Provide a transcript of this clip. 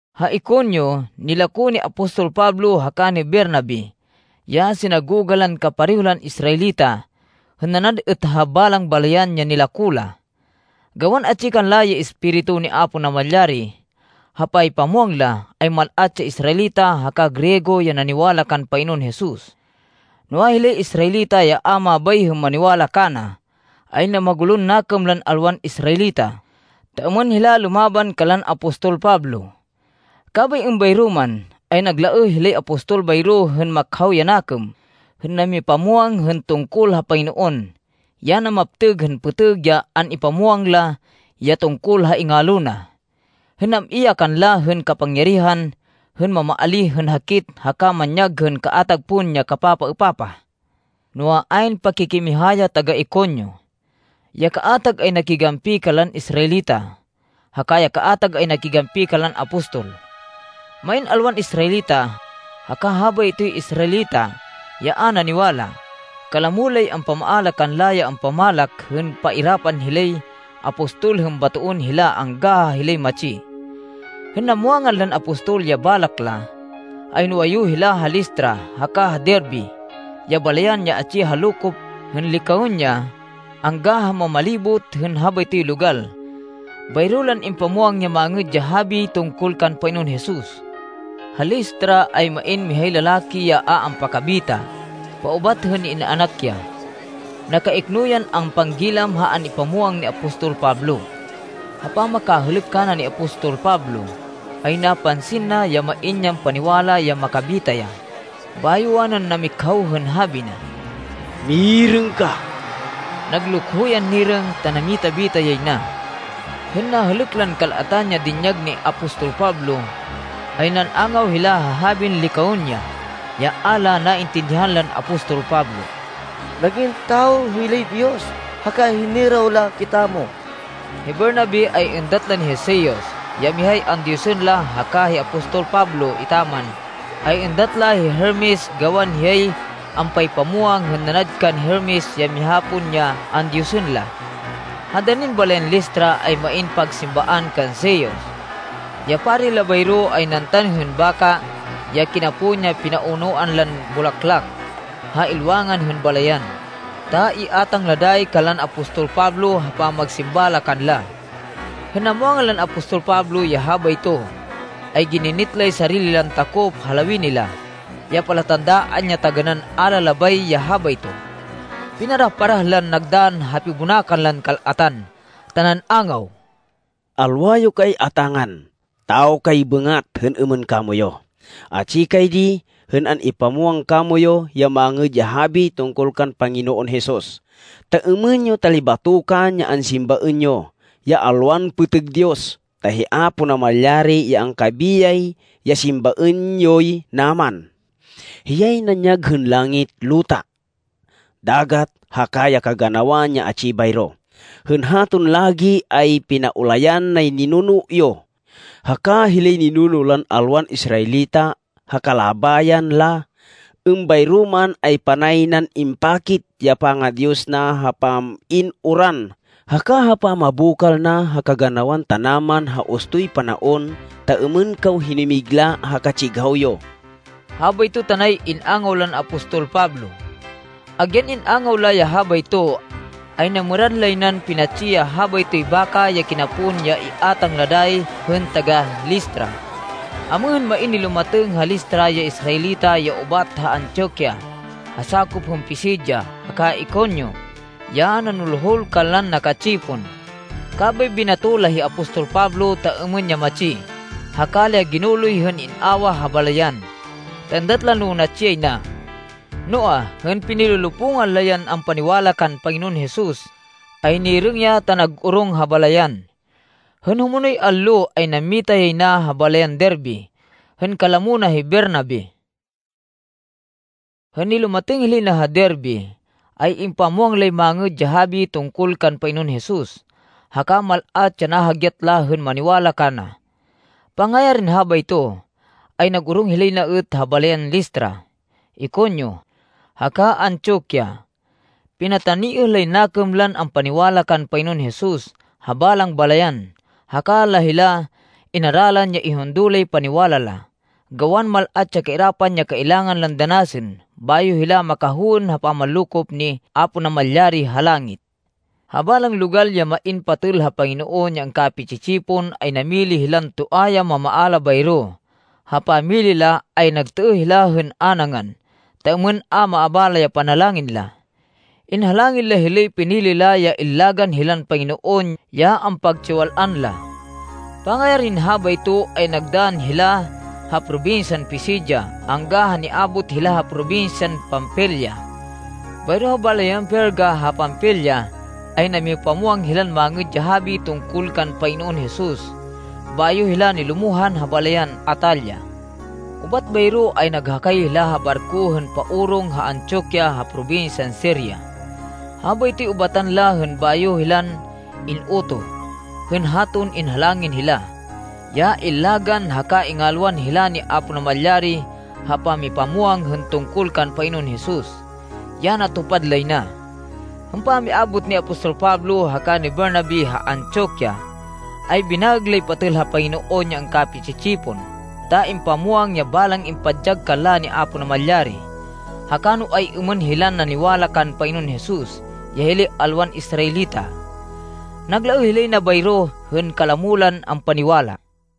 Ha Iconio, nilako ni apostol Pablo haka ni Bernabe, ya sinagoga lan kapareho lan Israelita hên nanad êt ha balang balayan ya nilako la. Gawan atsi kanla ya Espiritu ni Apo Namalyari ha paypamwang la, ay mal-at ya Israelita haka Griego ya naniwala kan Panginoon Jesus. Noa, hilay Israelita ya a mabay hên maniwala kana, ay namagulon nakêm lan alwan Israelita, ta êmên hila lumaban kanlan apostol Pablo. Kabay êmbayro man, ay naglaêh hilay apostol bayro hên makhaw ya nakêm hên namipamwang hên tungkol ha Panginoon, ya namaptêg hên pêtêg ya an-ipamwang la ya tungkol ha ingalo na, hên nam-i ya kanla hên kapangyarihan hên mamaalíh hên hakit haka manyag hên kaatag pon ya kapapaêpapah. Noa, ayn pakikimiha ya taga-Iconio. Ya kaatag ay nakigampi kanlan Israelita, haka ya kaatag ay nakigampi kanlan apostol. Main alwan Israelita, haka habaytoy Israelita ya a naniwala, kalamo lay ampamaala kanla ya ampamalak hên pairapan hilay apostol hên batoên hila angga ha hilay matsi. Hên namwangan lan apostol ya balak la, ay nuwayu hila ha Listra haka ha Derbe ya balayan ya atsi ha lokop hên Licaonia angga ha mamalibot hên habaytoy logal. Bayro lan impamwang ya Mangêd ya Habi tungkol kan Panginoon Jesus. Ha Listra ay main mihay lalaki ya a ampakabita, paubat hên in-anak ya. Nakaikno yan ampanggilam ha an-ipamwang ni apostol Pablo. Ha pamakahêlêk kana ni apostol Pablo, ay napansin na, ya main yan paniwala ya makabita ya, bayo wanan namikhaw hên habi na, “Mirêng ka!” Naglukho yan nirêng ta namita-bita yay na. Hên nahêlêk lan kal-atan ya dinyag ni apostol Pablo, ay nan-angaw hila ha habin Licaonia, ya a la naintindihan lan apostol Pablo, “Nag-in tawo hilay diyos haka hiniraw la kitamo!” Hi Bernabe ay êndat lan hi Zeus, ya mihay andiyosên la haka hi apostol Pablo etaman, ay êndat la hi Hermes gawan hiyay ampaypamwang hên nanad kan Hermes ya miha pon ya andiyosên la. Ha danin balayan Listra ay main pagsimbaan kan Zeus. Ya pari la bayro ay nantan hên baka ya kinapon ya pinaunoan lan bulaklak, ha ilwangan hên balayan, ta iátang la dayi kanlan apostol Pablo ha pamagsimba la kanla. Hên namwangan lan apostol Pablo ya habayto, ay gininit lay sarili lan takop ha lawini la, ya palatandaan ya taganán a la labay ya habayto. Pinarah-parah lan nagdann ha pibonakan lan kal-atan ta nan-angaw, “Alwa yo kay atángan! Tawo kay bêngat hên êmên kamoyu! Atsi kay di hên an-ipamwang kamoyu ya Mangêd ya Habi tungkol kan Panginoon Jesus, ta êmên yo talibatokan ya ansimbaên yo, ya alwan pêtêg diyos, ta hi Apo Namalyari ya angkabiyay ya simbaên yoy naman. Hiyay nanyag hên langit, luta, dagat haka ya kaganawan ya atsi bayro. Hên haton lagi ay pinaulayan nay ninuno yo, haka hilay ninuno lan alwan Israelita ha kalabayan la. Êmbayro man, ay panay nan impakit ya panga-Diyos na ha pam-in uran haka ha pamabokal na ha kaganawan tanaman ha ustoy panaon, ta êmên kaw hinumigla ha katsighaw yo,” habayto tanay in-angaw lan apostol Pablo. Agyan in-angaw la ya habayto, ay namêrad lay nan pinatsi ya habaytoy baka ya kinapon ya iátang la dayi hên taga-Listra. Amêhên, main nilumatêng ha Listra ya Israelita ya ubat ha Antioquia ha sakop hên Pisidia haka Iconio ya nanulhul kanlan naka-tsipon, kabay binato la hi apostol Pablo ta êmên ya matsi, haka la ya ginuloy hên in-awah ha balayan, ta êndat la no natsi yay na. Noa, hên pinilolopungan la yan ampaniwala kan Panginoon Jesus, ay nirêng ya ta nag-orong ha balayan. Hên humonoy allo, ay nammita yay na ha balayan Derbe hên kalamo na hi Bernabe. Hên nilumatêng hilay na ha Derbe, ay impamwang lay Mangêd ya Habi tungkol kan Panginoon Jesus, haka mal-at ya nahagyat la hên maniwala kana. Pangayarin habayto ay nag-orong hilay na êt ha balayan Listra, Iconio, haka Antioquia. Pinataniêh lay nakêm lan ampaniwala kan Panginoon Jesus ha balang balayan, haka la hila inaralan ya ihundo lay paniwala la, gawan mal-at ya kairapan ya kailangan lan danasên bayo hila makahowên ha pamanlokop ni Apo Namalyari ha langit. Ha balang logal ya main patêl ha Panginoon ya angkapi-tsi-tsipon ay namili hilan toa ya mamaala bayro, ha pamili la, ay nagtêêh hila hên a nangan, ta êmên a maabala ya panalangin la. Inhalangin la hilay pinili la ya illagan hilan Panginoon ya ampagtsiwal-an la. Pangayarin habayto ay nagdann hila ha probinsyan Pisidia angga ha niabot hila ha probinsyan Panfilia. Bayro ha balayan Perga ha Panfilia, ay namipamwang hilan Mangêd ya Habi tungkol kan Panginoon Jesus bayo hila nilumohan ha balayan Atalia. Ubat bayro ay naghakay hila ha barko hên paorong ha Antioquia ha probinsyan Siria. Habaytoy ubatan la hên bayo hilan in-utoh, hên haton inhalangin hila, ya illagan haka ingalwan hila ni Apo Namalyari ha pamipamwang hên tungkol kan Panginoon Jesus, ya natupad lay na. Hên pamiabot ni apostol Pablo haka ni Bernabe ha Antioquia, ay binaêg lay patêl ha Panginoon ya angkapi-tsi-tsipon, ta ipamwang ya balang impadyag kanla ni Apo Namalyari, haka no ay-êmên hilan naniwala kan Panginoon Jesus ya hilay alwan Israelita. Naglaêh hilay na bayro hên kalamo lan ampaniwala.